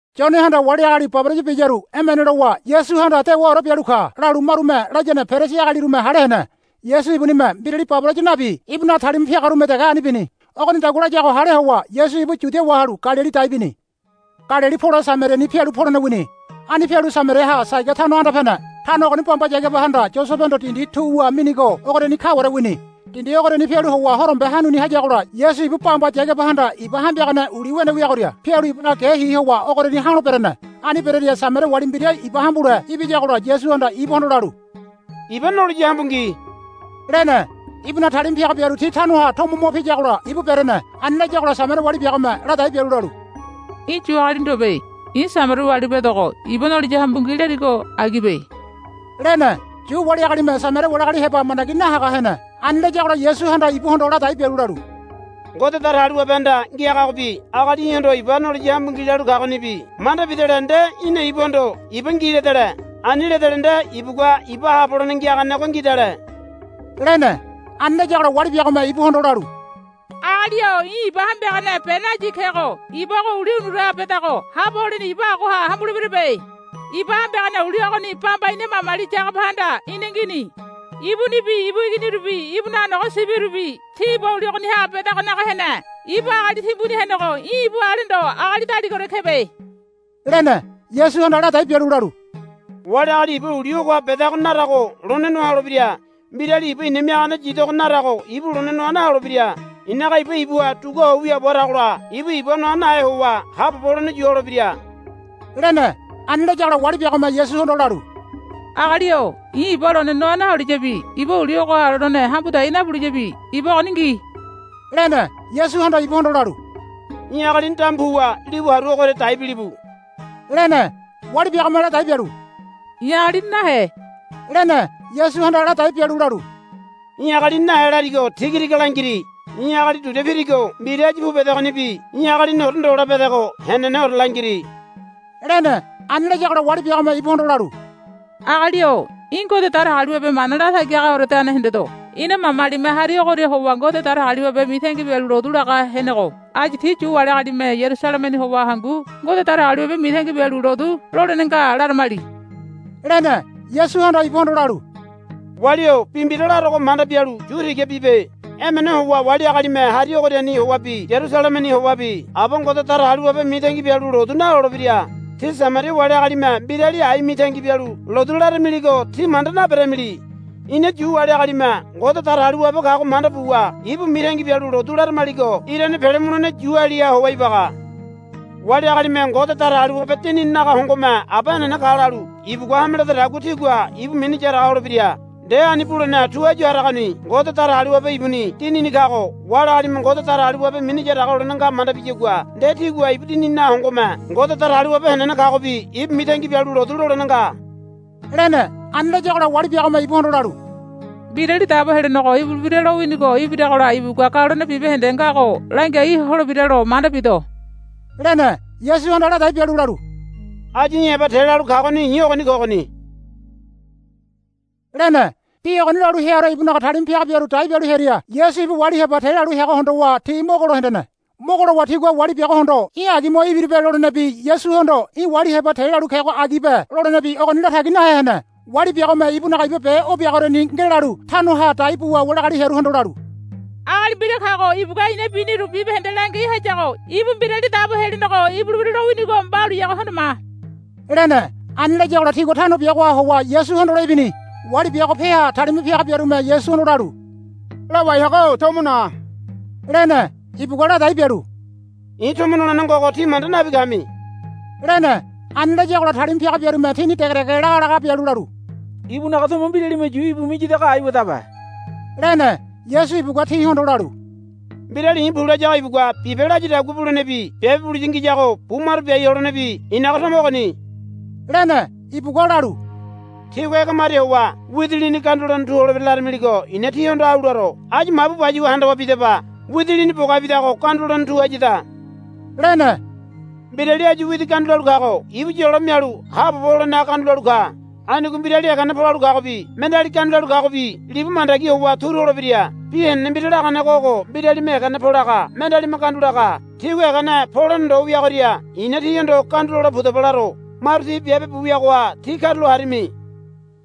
Yonehanda wali agali baboraya biyaru emene lowa Yasuhanda dewaore bialu ka, lalu marume layane Perisi agalirume hale hene. Yasu ibunime mbirali baboraya nabi ibunaga talima piagarume dege ani bini. Ogonidagua layago hale howa Yasu ibu Yudia wahalu Galili dai bini. Galili pole Samariani pialu polene wini. Ani pialu Samariaha Saiga tano anda pene. Tano ogoni bamba Yagabahanda Yosebehondo dindi tu wa minigo ogoriani kaware wini. Dindi ogoriani pialu howa horombe hanuni hayagola Yasu ibu bamba Yagabahanda iba hambiagane uli wene wiagoria pialu ibunaga ge hi howa ogoriani ha̱lo berene. Ani berearia Samaria wali mbira iba hambule ibiyagola Yasuhanda ibuhondo lalu, Iba noliya hambu ngi, lene. Ibunaga talima piaga biaru ti tanoha tomo mo piyagola ibu berene. Ani layagola Samaria wali biagome ladai bialu lalu, Í̠ Yu agali ndobe. I̱ Samaria wali bedogo iba noliya hambu ngi larigo agibe, lene. Yu wali agalime Samaria wali agali heba mandagi nahaga hene. Ani layagola Yasuhanda ibuhondo ladai bialu lalu, Ngode Datagaliwabehanda ngiagagobi agali í̠hondo iba noliya hambu ngi lalu kagonibi manda bidele nde í̠na ibuhondo iba ngi ledele. Ani ledele nde ibugua iba haabo holene ngiaganego ngidale, lene. Ani layagola wali biagome ibuhondo lalu, Agali-o í̠ iba hambiagane be nayi kego iba ogo uli unuraha bedago haabo holene iba agoha hambuleberebe. Iba hambiagane uli ogoni bamba ina mamali Yagabahanda ina ngini. Ibunibi ibu iginirubi ibunaga nogo sibirubi ti iba uli ogoniha bedago naga hene. Ibu agali timbuni henego í̠ ibu ale ndo agali daligaore kebe, lene. Yasuhanda ladai bialu lalu, Wali agali iba uli ogoha bedago narago lone noa holebira. Mbirali iba i̱na miagane yidogo narago ibu lone noa naholebira. I̱naga iba ibuha duguaho wiaabo haragola ibu iba noa nahe howa haabobo holene yulebira, lene. Ani layagola wali biagome Yasuhondo lalu, Agali-o i̱ iba lone noa naholiyabi iba uli ogoha lone hambu dai nabuliyabi iba ogoni ngi, lene. Yasuhanda ibuhondo lalu, Í̠ agalini damu puwa libu haru ogoria dai bilibu, lene. Wali biagome ladai bialu, I̱ agalini nahe, lene. Yasuhanda ladai bialu lalu, I̱ agalini nahe larigo tiga tiga langiri. Í̠ agali duria pirigo mbira áyu pu bedegonibi í̠ agaliniore ndola bedego heneneore langiri, lene. Ani layagola wali biagome ibuhondo lalu, Agali-o í̠ Ngode Datagaliwabe mana latagi hagaoredane hendedo. Ina mamalime hari ogoria howa Ngode Datagaliwabe mitangi bialu lotu laga henego. Áyu tí Yu wali agalime Yarusalemeni howa hangu Ngode Datagaliwabe mitangi bialu lotu lolene nga laramili, lene. Yasuhanda ibuhondo lalu, Wali-o bi mbira larogo manda bialu yu tiga bibe. Emene howa wali agalime hari ogoriani howabi Yarusalemeni howabi Aba Ngode Datagaliwabe mitangi bialu lotu nalolebira. Tí Samaria wali agalime mbirali ai mitangi bialu lotu laramiligo tí manda naberamili. Ina Yu wali agalime Ngode Datagaliwabe kago manda buwa ibu mitangi bialu lotu laramaligo irane pele mulene Yualiha howa ibaga. Wali agalime Ngode Datagaliwabe Dinininaga hongome Aba henene ka lalu ibugua hame ledadagua tigua ibu mini yaraga holebira. Nde ani bulene tu áyu haragoni. Ngode Datagaliwabe ibuni Dinini kago wali agalime Ngode Datagaliwabe mini yaraga holene nga manda biyagua nde tigua ibu Dinininaga hongome Ngode Datagaliwabe henene kagobi ibu mitangi bialu lotu lolene nga, lene. Ani layagola wali biagome ibuhondo lalu, Mbirali Dabo Helenego ibulebira lowinigo ibiragola ibugua galone bibahende ngago langiai holebiralo manda bido, lene. Yasuhanda ladai bialu lalu, Áyu í̠ heba te lalu kagoni i̱ ogoni kogoni, lene. Bi ogoni lalu heaore ibunaga talima piaga biaru dai bialu hearia Yasu ibu wali heba te lalu heago hondowa ti mogo lo hendene. Mogo lowa tigua wali biagohondo, Í̠ agi mo ibiribe, lolenebi Yasuhondo, Í̠ wali heba te lalu kego agibe, lolenebi ogoni latagi nahe hene. Wali biagome ibunaga iba be o biagoriani ngelalu tanoha dai buwa wali agali hearuhondo lalu, Agali mbira kago ibugua i̱na biniru bibahende langiai hayago ibu Mbirali Dabo Helenego ibulebira lowinigo mbauleyago hondo ma, lene. Ani layagola tigua tano biagoha howa Yasu hondole ibini. Wali biago peaha talima piaga biarume Yasuhondo lalu, Lawai haga-o tomo na, lene. Ibugua ladai bialu, I̱ tomo nolene ngogo tí manda nabi kami, lene. Ani layagola talima piaga biarume tini degedege lagalaga bialu lalu, Ibunaga tomo mbiralime yu íbu miyadago aiwadabe, lene. Yasu ibugua tihondo lalu, Mbirali i̱ pu layago ibugua bibe layadagua bulenebi biabe buliya ngiyago bu maro biai holenebi i̱naga tomo ogoni, lene. Ibugua lalu, Tígua, Ege maria howa widi lini gandu lolene tu holebira, laramiligo i̱na tíhondo au laro. Áyu mabu bayuwa handawa bidaba. Widi lini bogabidago gandu lolene tu hayada, lene. Mbirali áyu widi gandu lalu kago ibu yolo mialu haabobo holenaga gandu lalu ka. Anigo mbirali egene polalu kagobi mendeali gandu lalu kagobi libu mandagi howa turu holebira. Bi henene mbira laganego ogo, Mbiralime egene polaga mendealime gandu laga. Tígua egene polene ndo wiagoria i̱na tíhondo gandu lole pudaba laro. Maru ti biabe bu wiagoha tí karulo harimi,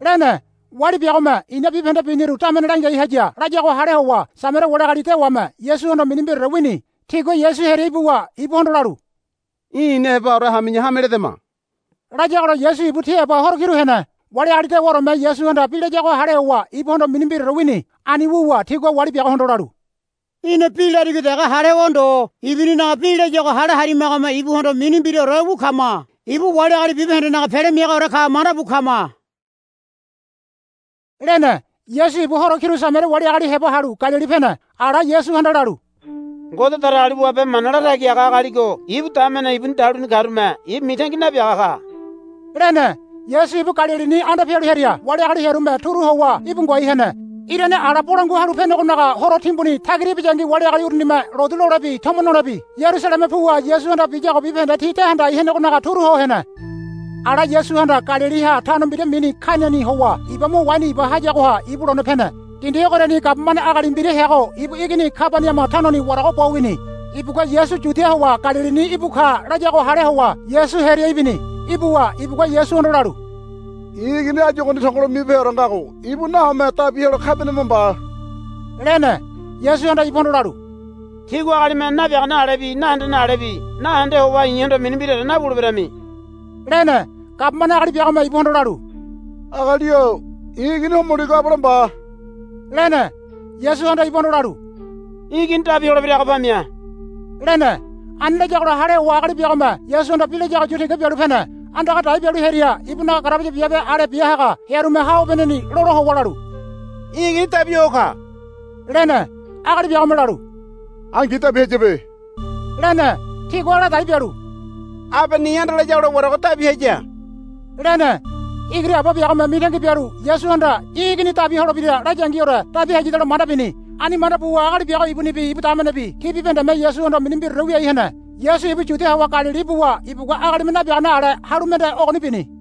lene. Wali biagome, I̱na bibahende biniru damene langiai haya, layago hale howa Samaria wali agali dewame Yasuhondo mini mbiraore wini. Tigua Yasu hearia ibuwa ibuhondo lalu, Í̠ ina hebaore hami̱ya hame ledama, layagola Yasu ibu ti heba horo kiru hene. Wali agali dewaoreme Yasuhanda bi layago hale howa ibuhondo mini mbiraore wini. Ani wuwa tigua wali biagohondo lalu, Í̠na bi larigo dege hale howa ndo ibuninaga bi layago hale harimagome ibuhondo mini mbiraore wu kama. Ibu wali agali bibahendenaga Pele Miagaore ka mandabu kama, lene. Yasu ibu horo kiru Samaria wali agali heba halu Galili pene. Ala Yasuhanda lalu, Ngode Datagaliwabe mana latagi haga agaligo ibu damene ibuni daluni karume ibu mitangi nabiaga ka, lene. Yasu ibu Galilini anda pialu hearia wali agali hearume turu howa íbu ngoai hene. Irane ala Bolangua Halu Penegonaga horo timbuni tagira ibiyangi wali agali urunime lotu lolebi tomo nolebi Yarusaleme puwa Yasuhanda biyago bibahende ti de handai henegonaga turu ho hene. Ala Yasuhanda Galiliha tano mbira mini Kainani howa iba mo waini iba hayagoha ibu lone pene. Dindi ogoriani gabumane agali mbira heago ibu igini Kabaniama tanoni warago bo wini. Ibugua Yasu Yudia howa Galilini íbu ka layago hale howa Yasu hearia ibini. Ibuwa ibugua Yasuhondo lalu, I̱ igini áyu ogoni tongolo mibeheore ngago ibu nahome dabi helo Kabaniama mba, lene. Yasuhanda ibuhondo lalu, Tígua agalime nabiagane alebi nahendene alebi nahende howa i̱hondo mini mbiraore nawuleberami, lene. Gabumane agali biagome ibuhondo lalu, Agali-o i̱ igini homoligo abale mba, lene. Yasuhanda ibuhondo lalu, Í̠ igini dabi holebirago pamia, lene. Ani layagola hale howa agali biagome Yasuhanda bi layago yu tiga bialu pene. Andaga dai bialu hearia ibunaga garabaya biabe ale bia haga hearume ha obeneni lola howa lalu, Í̠ igini dabi ho ka, lene. Agali biagome lalu, Angi dabi hayabe, lene. Tigua ladai bialu, Abe ni ande layagola warago dabi haya, lene. Igiri aba biagome mitangi bialu Yasuhanda, Í̠ igini dabi holebira, layangiore dabi hayadalo manda bini. Ani manda buwa agali biago ibunibi ibu damenebi ti bibahendeme Yasuhondo mini mbiraore wiai hene. Yasu ibu Yudia howa Galili ibuwa ibugua agalime nabiagane ale halu mende ogoni bini.